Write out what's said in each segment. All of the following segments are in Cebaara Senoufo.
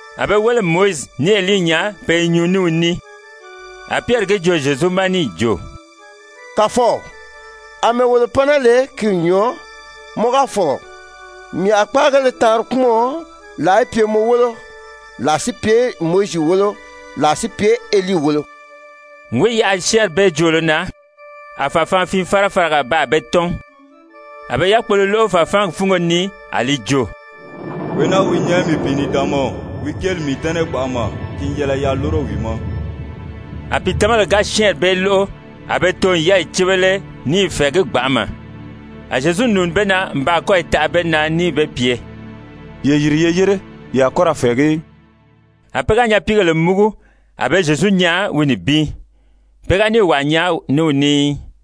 A be wéle n Mowizi ní Elii nyaa pe i nyuu ní wi ní. A Pyɛri gi joo Zyezu ma níì jo: «Kàfɔw, àmɛɛ wolo pan naa lè, ki n nyɔɔ. Mɔ ga fɔ̀lɔ mii a kpáagéle taanri kpúmɔn, làa í pye mɔ wólo, làa si pye Mowizi wólo, làa si pye Elii wólo.» N wi yaʔa syɛ́ɛnri bee joolo na, a fàfaanfii-fárafāraga baa be tɔ́n. A be yákpolo lóʔo fàfaangi fúngo ni a li jo: «Wee naa wi nyɛ mii pìinidaanmaw, wi kéeli n mii dɛ́nɛ gbanʔama. Ki n yɛlɛ yaa lúro wi ma.» A pìitamabèle ga syɛ́ɛnri bee lóʔo a be too n yɛ́ɛyi cíbele ní i fɛ̀ɛgí gbanʔama. A Zyezu nùuni be na n baa kɔ́yi taʔa be na níì be pye: «Ye yìri ye yére, ye a kɔ́ ra fɛ̀ɛgí í.» A pe ga nyapiigèle múgu, a be Zyezu nyaa wi nibin, pe ga níì wàa nyaa ní wi ní í.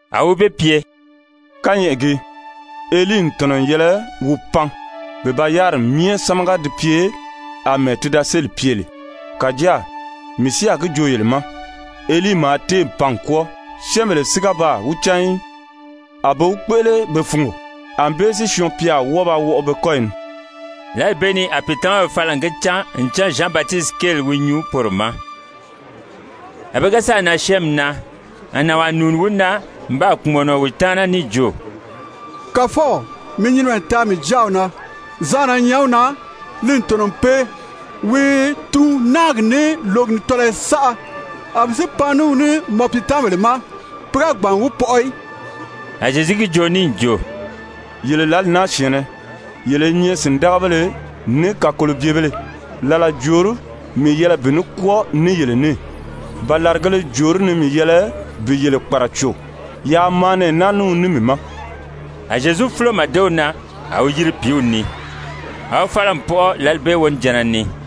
A wi be pye: «Kányɛʔɛ gii, Elii n tɔ̀nɔ n yɛlɛ wi pan bi ba yáriri myɛ sámaga di pye àmɛɛ ti da séli pye lè. Kàjáa mii si a gi joo yele ma, Elii maa téè pan n kwɔ́ɔ, syɛ́ɛnbèle si ga baa wi cán í, a be wi kpéʔele be fungo. Anbée si Syɔɔn-pya a wɔ́ɔ ba wɔʔɔ be kɔ́yi ni.» Lǎli bee ni a pìitamabèle fala n gi cán ncan Zyan Batisiti kéeli wi nyuu poro ma. A be ga sáà nan syɛ́ɛnmi na, a nànwaa nùuni wi na n baa kpùmɔnɔ wi taana níì jo: «Kàfɔw, mi nyinimɛ taa mii jáaw na, zaanna i nyɛ wi na, li n tɔ̀nɔ n pee. Wi i tuun náagi, ní lǒgi ni tɔlɔyɔ saʔa. A mii si pan ní wi ní mɔ piitamabèle ma, pe ga gbàn n wi pɔʔɔ í.» A Zyezu gi joo níì jo: «Yele lǎli naa syɛ̀ɛnnɛ, yele i nyɛ sìndagabéle ní kakolobyebèlē. Làla jòorí mii yɛlɛ bi ní kwɔ́ɔ ní yele ní? Ba làrigēle jòorí ni mii yɛlɛ bi yele kpàraco? Yaa maa nɛɛ naa ní wi ní mii ma.» A Zyezu fúlo màdew na, a wi yiri pìíw ni. A wi fala n pɔʔɔ lǎli bee wonijanna ni.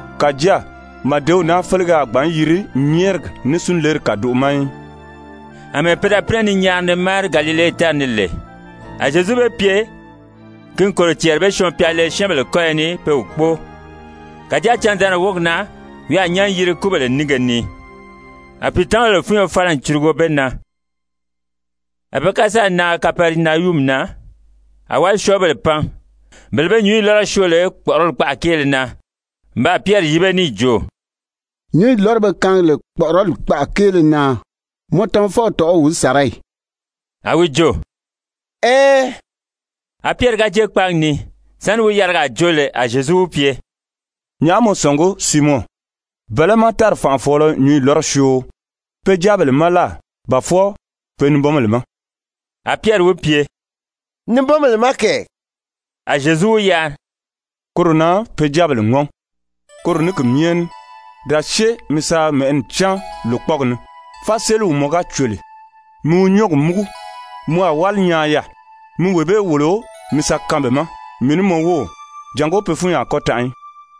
Kàjáa màdew naa félege a gbǎn yiri nyɛ́ɛrigi ní súnleri kàdoʔo ma í.]» Amɛɛ pe da pínɛ ni nyaari ni máari Galile tári ni lè, a Zyezu be pye ki n kòro cɛɛri bé Syɔɔn-pya le syɛ́ɛnbèle kɔ́yɔ ni pe wi kpóo. Kàjáa candaanri wógi na wi a nyán yiri kúbèle nínge ni. A pìitamabèle fúnyo fala n curugo be na. A pe ga sáà nan Kapɛrinayumi na, a wálisyɔɔbèle pan, bele be nyǔnyi lɔ́rɔ syoo lè kpɔ̀ʔɔrɔli kpaʔa kéele na, n baa Pyɛri yíbe níì jo: «Nyǔnyi lɔ́rɔ be kaangi lè kpɔ̀ʔɔrɔli kpaʔa kéele na, mɔ tamafɔw tɔ̀ʔɔ́ o wi sàra ì?» A wi jo: «Ɛɛn.» A Pyɛri ga jée kpáagi ni, sáni wi yarigaa joo lè, a Zyezu wi pye: «Nyàʔá mɔ sɔ̀ngí, Siimɔn? Bɛ̀lɛ́ má tári fànʔafɔɔlɔ nyǔnyi lɔ́rɔ syoo? Pe jáabèle má láà ba fwɔɔ pe nibɔnbèle ma?» A Pyɛri wi pye: «Nibɔnbèle má kɛ!» A Zyezu wi yari: «Koro na pe jáabèle ŋɔ́n. Koro ní ki myɛ ní, da syée mi sa mɛ̀ʔɛni cáan lòkpɔɔgi ni. Fáseliw mɔ ga cò lè, mi wi nyɔ́ɔgi múgu, mɔ a wáli nyaa yaà. Mi wee bee wòlo mi sa kaan be ma, mii ní mɔ wów, jàngó pe fúnyi a kɔ́ tanʔa í.»